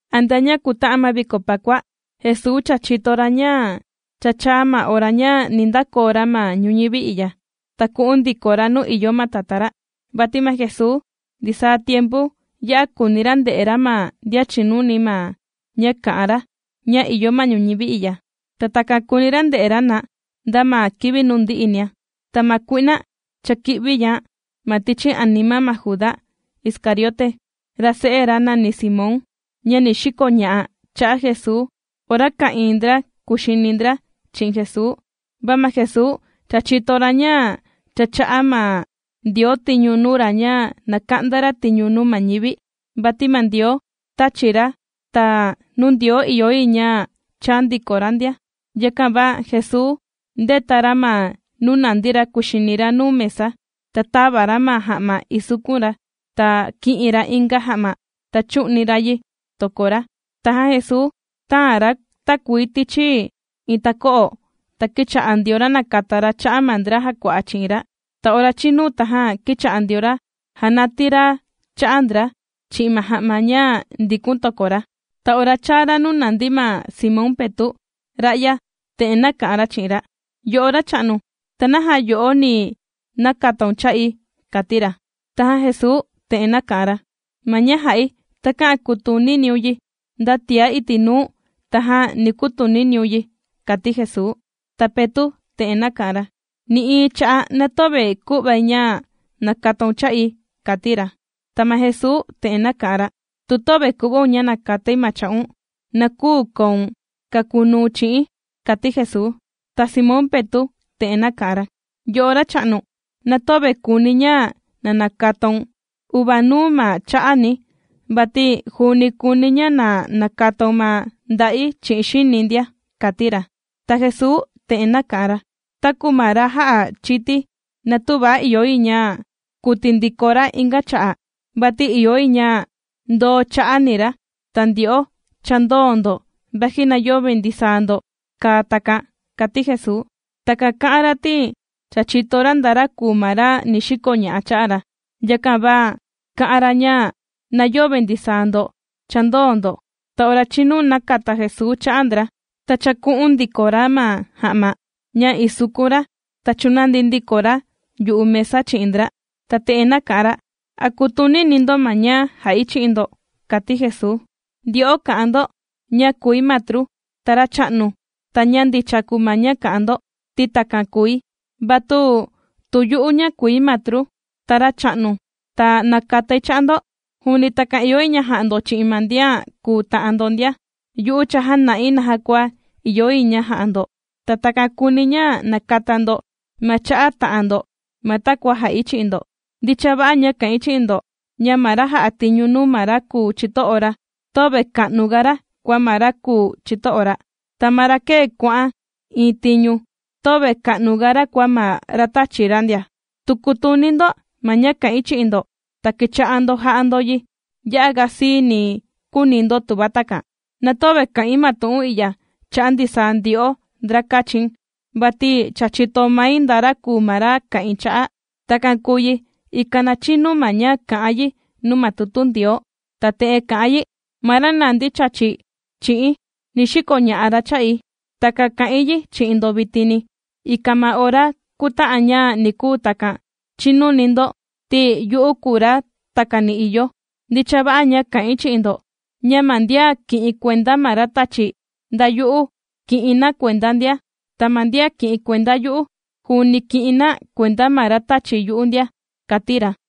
Antea ña kuta'an ma viko Pakua, Jesuu cha chìto ra ña cha chāa ma ora ña ni ndakoo ra ma ñuñivi i'ya, ta ku'un ndiko ra nuu ìyo ma Tatá ra. Vati ma Jesuu ndisaa tiempu ya'a kùuni ra nde'e ra ma ndian chìnuni ma ña kà'an ra ña ìyo ma ñuñivi i'ya. Ta takan kùuni ra nde'e ra na, nda ma kivi nuu ndi'inia. Ta ma kui'na cha kī'vián' ma tichi anima ma Judá Iscariote, ra se'e ra nàni Simón, ña ni xikoña'a cha'a' Jesuu ora ka'ìin ndra kuxini ndra chi'in Jesuu. Va ma Jesuu cha chìto ra ña cha chà'a ma Ndioo tiñu nuu ra ña na ka'nda ra tiñu nuu ma ñivi, vati ma Ndioo tāchi ra, ta nuu Ndioo ìyo yi ña chaa ndiko ra ndia. Yakan va Jesuu ndēta ra ma nuu nàndi ra kuxini ra nuu mesa, ta tāva ra ma ja'ma isukun ra, ta kī'in ra inga ja'ma ta chū'ni ra yi toko ra. Tajan Jesuu tāan ra takuii tichi iin tako'o ta kīcha'a ndio ra nàkata ra cha'a ma ndra jàkua'a chi'in ra. Ta ora chīnu, tajan kīcha'a ndio ra jànatii ra cha'a ndra chi'in ma ja'ma ña ndìkun toko ra. Ta ora chaa ra nuu nàndi ma Simón Petu', ra'ya te'en nāka'an ra chi'in ra: ―Yo'o Racha'nu, ¿ta naja yo'o ni nakataun cha'i? ―kàti ra. Tajan Jesuu te'en nāka'an ra: ―Ma ña jà'i takä'an kutuniniun yi, nda tiá iti' nuu tajan ni kutuniniun yi ―kàti Jesuu. Ta Petu' te'en nāka'an ra: ―Nï'iin cha'a' na töve ku'vai ña nakataun cha'i ―kàti ra. Ta ma Jesuu te'en nāka'an ra: ―Tu töve ku'vaun ña na nakatai ñu̱n, na küu koun kakunuu̱n chi'i̱n ―kàti Jesuu. Ta Simón Petu' te'en nāka'an ra: ―Yo'o Racha'nu, na töve kùuni̱ ña na nakataun uvaa ma cha'ani, vati juuni kùuni̱ ña na nakataun ma nda'i chi'in xini̱ ndia ―kàti ra. Ta Jesuu te'en nāka'an ra: ―Taku ma ra já chīti, na tüva ìyo yi ña kuti ndiko ra inga cha'a', vati ìyo yi ña ndoo cha'a ni ra. Ta ndyo'o cha ndōo ndo vaji na yöve ndisaa ndo kàa takan ―kàti Jesuu. Takan kā'an ra ti cha chìto ra nda ra kùu ma ra ni xikoña'a cha'a ra, yakan va kà'an ra ña, na yöve ndisaa ndo cha ndōo ndo. Ta ora chīnu nākata Jesuu cha'a ndra, ta chāku'un ndiko ra ma ja'ma ña isukun ra, ta chūnandi ndiko ra yu'u mesa chi'in ndra, ta te'en nāka'an ra: ―¿A kùtunini ndo ma ña jà'i chi'in ndo? ―kàti Jesuu―. Ndyo'o kà'an ndo ña kùi matru, ta Racha'nu, ta ña ndicha kùu ma ña kà'an ndo, ti takan kùi. Va tu yu'u ña kùi matru, ta Racha'nu, ta nākatai cha'a ndo. Juuni takan ìyo yi ña ja'a ndo chi'in ma ndian kùu ta'an ndo ndia. Yu'u cha jāna'i naja kua ìyo yi ña ja'a ndo, ta takan kùuni̱ ña nakata ndo ma cha'a ta'an ndo ma takua jā'i chi'in ndo. Ndicha va'a ña kà'in chi'in ndo, ña ma ra jà'a tiñu nuu ma ra kùu chito'o ra, töve ka'nuga ra kua ma ra kùu chito'o ra. Ta ma ra kēe kuà'an iin tiñu, töve ka'nuga ra kua ma ra tāchi ra ndia. Tu kutuni ndo ma ña kà'in chi'in ndo, ta kicha'a ndo ja'a ndo yi, ya'aga siini ni kuuni ndo tuva takan. ’Na töve kà'in ma tu'un i'ya cha'a' ndisaa ndyo'o ndra kāchi̱n, vati cha chìto mai nda ra kùu ma ra kà'in cha'a'. Takan kùu yi ikan na chinu ma ña kà'an yi nuu ma tutu Ndioo, ta te'en kà'an yi: “Ma ra nàndi chàchi chi'i̱n, ni xikoña'a ra cha'i.” Takan kà'in yi chi'in ndo vitini, ikan ma ora kuta'an ña ni kuu takan, chinuni ndo ti yu'u kùu ra takani ìyo. Ndicha va'a ña kà'in chi'in ndo, ña ma ndian kì'in kuenda ma ra tàchi̱, nda yu'u kì'in na kuenda ndia. Ta ma ndian kì'in kuenda yu'u, juuni kì'in na kuenda ma ra tāchi yu'u ndia ―kàti ra.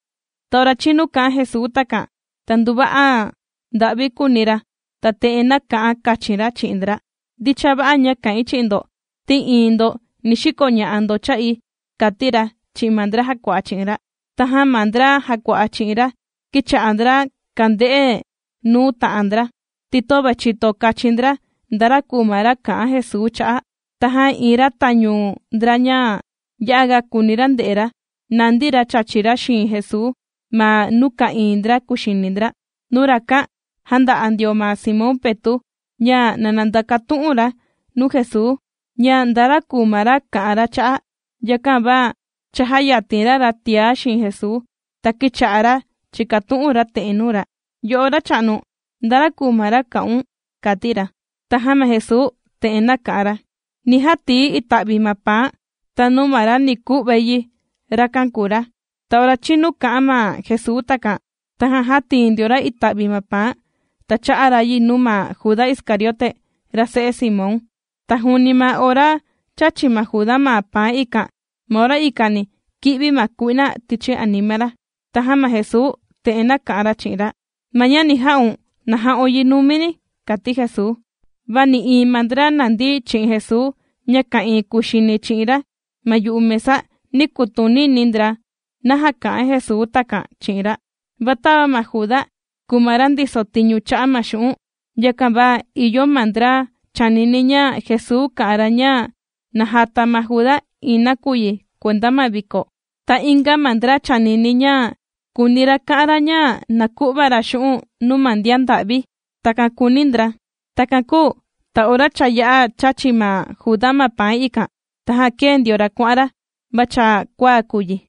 Ta ora chīnu kā'an Jesuu takan, ta nduva'a nda'vi kūuni ra, ta te'en nāka'an kachin ra chi'in ndra: ―Ndicha va'a ña kà'in chi'in ndo, ti iin ndo ni xikoña'a ndo cha'i ―kàti ra chi'in ma ndra jàkua'a chi'in ra. Tajan ma ndra jàkua'a chi'in ra kīcha'a ndra kànde'e nuu ta'an ndra, ti töve chìto kachin ndra nda ra kùu ma ra kà'an Jesuu cha'a'. Tajan iin ra tañu ndra ña ya'aga kùuni ra nde'e ra, nàndi ra chàchi ra xiin Jesuu ma nuu ka'ìin ndra kuxini ndra. Nuu rakan jānda'a ndio ma Simón Petu' ña na ndakatu'un ra nuu Jesuu, ña nda ra kùu ma ra kà'an ra cha'a'. Yakan va chājayatin ra ra tiá xiin Jesuu, ta kīcha'a ra chìkatu'un ra te'en nuu ra: ―Yo'o Racha'nu, ¿nda ra kùu ma ra kà'un? ―kàti ra. Tajan ma Jesuu te'en nāka'an ra: ―Ni jatii̱ ita'vi ma paan, ta nuu ma ra ni ku'vai yi, rakan kùu ra. Ta ora chīnu kā'an ma Jesuu takan, tajan jātii ndio ra ita'vi ma paan, ta chā'a ra yi nuu ma Juda Iscariote, ra se'e Simón. Ta juuni ma ora chāchi ma Juda ma paan ikan, ma ora ikani kī'vi ma kui'na tichi anima ra. Tajan ma Jesuu te'en nāka'an ra chi'in ra: ―Ma ña ni ja'un, na ja'un yi numini ―kàti Jesuu. Va nï'iin ma ndra nàndi chi'in Jesuu ña ka'ìin kuxini chi'in ra ma yu'u mesa, nī kutunini ndra naja kà'an Jesuu takan chi'in ra. Va tava ma Juda kùu ma ra ndiso tiñu cha'a' ma xu'un', yakan va ìyo ma ndra chānini ña Jesuu kà'an ra ña na jata ma Juda iin nakuyi kuenda ma viko, ta inga ma ndra chānini ña kūuni ra ka'an ra ña na ku'va ra xu'un' nuu ma ndian nda'vi. Takan kūuni ndra. Takan kūu ta ora cha yā'a chāchi ma Juda ma paan ikan, tajan kēe ndio ra kuà'an ra, va cha kuaa kùu yi.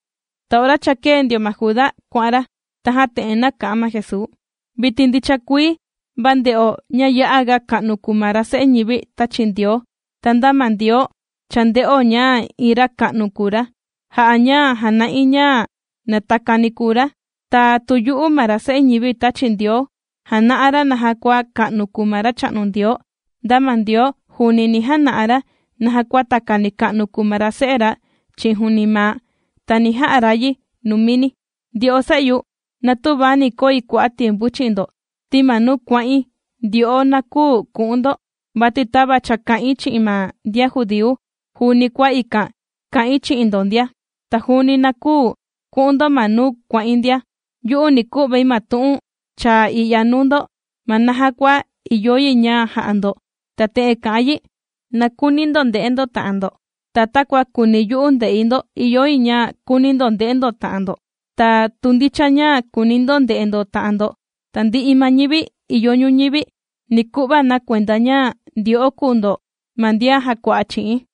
Ta ora cha kēe ndio ma Juda kuà'an ra, tajan te'en nāka'an ma Jesuu: ―Vitin ndicha kuii va nde'o ña ya'aga ka'nu kùu ma ra Se'e Ñivi tāchi Ndioo, ta nda ma Ndioo cha ndē'o ña iin ra ka'nu kùu ra, jà'a ña jàna'i ña na takani kùu ra. Ta tu yu'u ma ra Se'e Ñivi tāchi Ndioo jàna'a ra naja kua ka'nu kùu ma Racha'nu Ndioo, nda ma Ndioo juuni ni jana'a ra naja kua takani ka'nu kùu ma ra Se'e ra chi'in juuni maa', ta ni ja'a ra yi numini. ’Ndyo'o se'yu, na tüva ni koi kua'a' tiempu chi'in ndo, ti ma nuu kuà'in, ndyo'o na küu ku'un ndo, vati tava cha kā'in chi'in ma ndian judíu juuni kua ikan kà'in chi'in ndo ndia. Ta juuni na küu ku'un ndo ma nuu kuà'in ndia. Yu'u ni ku'vai ma tu'un chaa i'ya nuu ndo ma naja kua ìyo yi ña ja'a ndo, ta te'en kà'an yi: Na kuuni ndo nde'e ndo ta'an ndo. Ta takua kùuni yu'u nde'i ndo ìyo yi ña kuuni ndo nde'e ndo ta'an ndo. Ta tu ndicha ña kuuni ndo nde'e ndo ta'an ndo, tandi'i ma ñivi ìyo ñuñivi, ni ku'va na kuenda ña ndyo'o kùu ndo ma ndian jàkua'a chi'i̱n.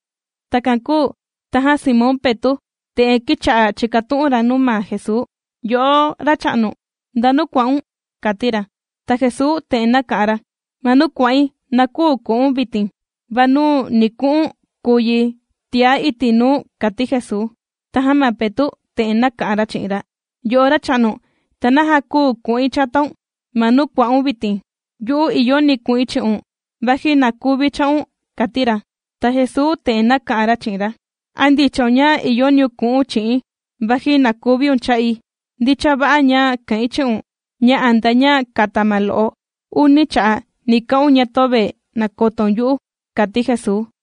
Takan kūu tajan Simón Petu', te'en kīcha'a chìkatu'un ra nuu ma Jesuu: ―Yo'o Racha'nu, ¿ndanu kuà'un? ―kàti ra. Ta Jesuu te'en nāka'an ra: ―Ma nuu kuà'in, na küu ku'u̱n vitin, va nuu ni ku'u̱n kùu yi tiá iti' nuu ―kàti Jesuu. Tajan ma Petu' te'en nāka'an ra chi'in ra: ―Yo'o Racha'nu, ¿ta naja küu ku'in chataun ma nuu kuà'un vitin? ¡Yu'u ìyoni ku'in chi'un, vaji na kuvi̱ cha'un! ―kàti ra. Ta Jesuu te'en nāka'an ra chi'in ra: ―¿A ndichaun ña ìyoniun ku'u̱n chi'i̱n vaji na kuviun cha'i? Ndicha va'a ña kà'in chi'un ña antea ña nda'yu ma lo'o, uni cha'a' ni ka'un ña töve nàkotoun yu'u ―kàti Jesuu.